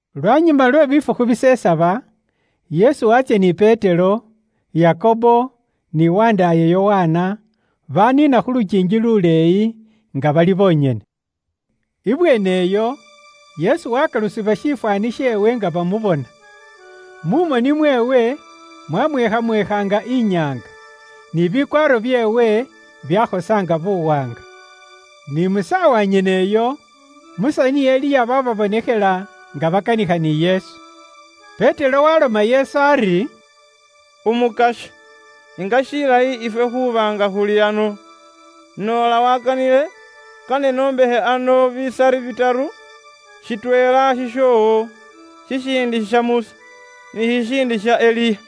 Lwanyuma lwe bifukhu bisesaba, Yesu waatsya ni Petero, Yakobo, ni wandaaye Yokana, baaniina khu lukiingi luleeyi, nga bali bonyene. Ibweene iyo Yesu wakalusibwa shifwaani sheewe nga bamubona. Mu moni mweewe mwamweekhamweekha nga inyaanga, ni bikwaaro byeewe byakhosa nga buwaanga. Ni mu saawa nyene iyo, Musa ni Eliya bababonekhela nga bakanikha ni Yesu. Petero waaloma Yesu ari, “Umukasya, nga shilayi ifwe khuuba nga khuli ano. Noola waakanile, kane noombakhe ano bisari bitaru; shitweela shishoowo, shishiindi sha Musa, ni shishiindi sha Eliya.”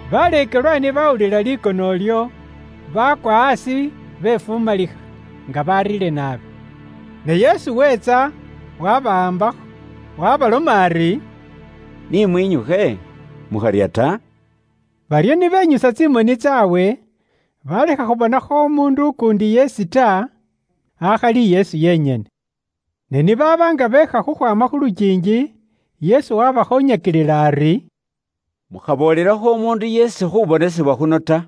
Baleekelwa ni baawulila likono ilyo, baakwa aasi befumalikha, nga bariire naabi. Ne Yesu weetsa, waabawaambakho, waabaloma ari, “Ni mwinyukhe, mukharya ta.” Baryo ni benyusa tsimoni tsaabwe, baalekha khubonakho umuundu ukuundi yeesi ta, akhali Yesu yenyene. Ne ni baaba nga beekha khukhwaama khu lukiingi, Yesu waabakhoonyakilila ari, “Mukhaboolelakho umuundu yeesi khu khubonesebwa khuno ta,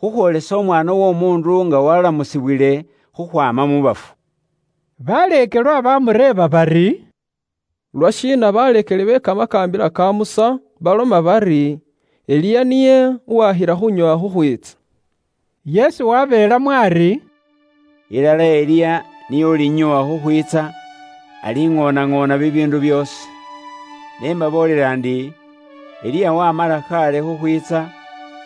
khukhwoolesa Umwaana w'Omuundu nga waalamusibwile khukhwaama mu bafu.” Baleekelwa baamureeba bari, “Lwashiina baleekeli be kamakaambila ka Musa baloma bari, Eliya niye uwaakhila khuunyoowa khukhwiitsa?” Yesu wabeelamo ari, “Ilala Eliya niye ulinyoowa khukhwiitsa, aliŋoonaŋoona bibiindu byoosi. Ne mbaboolela ndi, Eliya wamala khaale khukhwiitsa,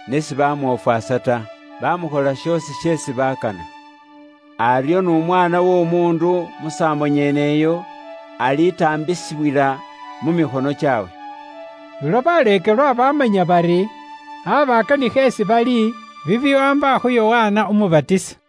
ne sibamwofwasa ta, bamukhola shoosi sheesi bakana. Aryo n'Umwaana w'Omuundu musaambo nyeneyo alitaambisibwila mu mikhono kyaabwe.” Ulwo baleekelwa baamanya bari, aaba akanikha isi bali bibiwaamba khu Yokana Umubatisa.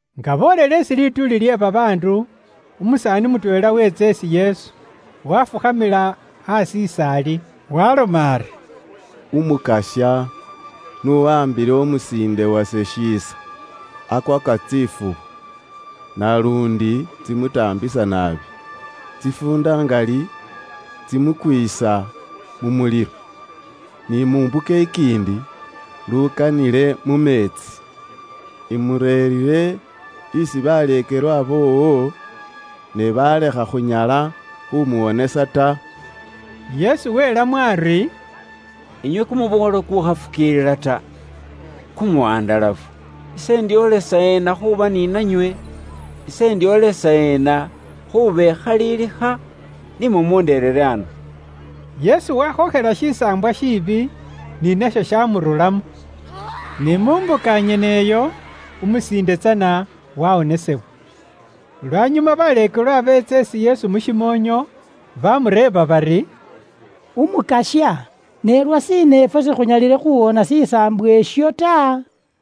Nga boolele isi lituuli lye babaandu, umusaani mutweela weetsa isi Yesu, wafukhamila aasi is'ali. Waloma ari, “Umukasya n'uwaambile umusiinde wase shiisa. Akwaka tsifubu, naluundi tsimutaambisa naabi. Tsifuunda ngali, tsimukwiisa mu mulilo, ni mu mbuka ikiindi lukanile mu meetsi. Imureerire isi baleekelwa boowo, ne baalekha khunyala khumuwonesa ta.” Yesu weelamo ari, “Inywe muli kumuboolo kukuukhafukiilila ta, kukwaborokha, ise indyoolesa eena khuuba ni nanywe? Ise indyoolesa eena khuubekhalilikha? Ni mumunderere ano.” Yesu waakhookhela shisaambwa shiibi, ni nasho shaamururamo. Ni mu mbuka nyeneyo, umusiinde tsana waawonesebwa. Lwanyuma baleekelwa beetsa isi Yesu mu shimoonyo, baamureeba bari, “Umukasya, ne lwashiina ifwe sikhunyalile khuuwoona shisaambwa isho ta?”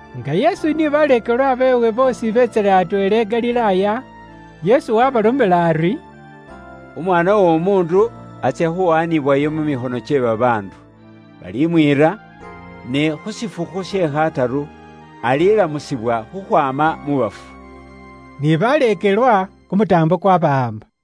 Nga Yesu ni baleekelwa beewe boosi beetsile atweela i Galilaaya, Yesu waabalomela ari, “Umwaana w'Omuundu atsya khuwaanibwayo mu mikhono kye babaandu. Balimwiira, ne khu shifukhu she khataru, alilamusibwa khukhwaama mu bafu.” Ni baleekelwa kumutaambo kwabawaamba.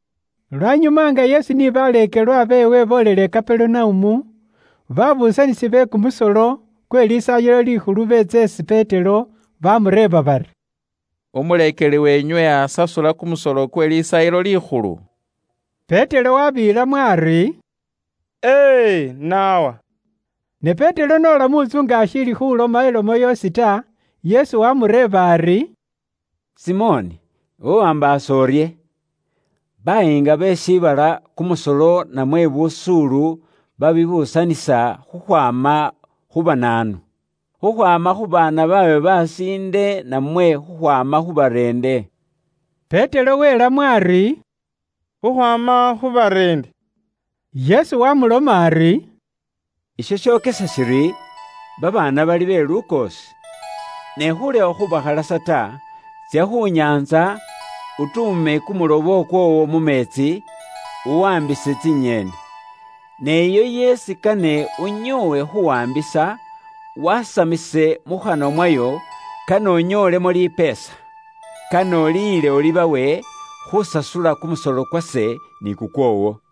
Lwanyuma nga Yesu ni baleekelwa beewe boolele i Kaperunaumu, babuusanisi be kumusolo kwe Lisaayilo Likhulu beetsa isi Petero baamureeba bari, “Umuleekeli weenywe asasula kumusolo kwe Lisaayilo Likhulu?” Petero wabeelamo ari, “E e, naawa.” Ne Petero n'ola mu ntsu nga ashiili khuloma ilomo yoosi ta, Yesu waamureeba ari, “Simoni, iwe waambaasa urye? Bayiinga be shiibala, kumusolo namwe busuulu babibuusanisa khukhwaama khu banaanu? Khukhwaama khu baana baabwe besiinde namwe khukhwaama khu bareende?” Petero welamo ari, “Khukhwaama khu bareende.” Yesu waamuloma ari, “Isho shokesa shiri, babaana bali be lukoosi. Ne khulekha khubakhalasa ta, tsya khu nyaantsa, utuume kumulobo kwoowo mu meetsi, uwaambise tsinyeeni. Ne iyo yeesi kane unyoowe khuwaambisa, wasamise mu khanwa mwayo, kane unyoolemo lipeesa. Kane uliyile, ulibawe, khusasula kumusolo kwase ni kukwoowo.”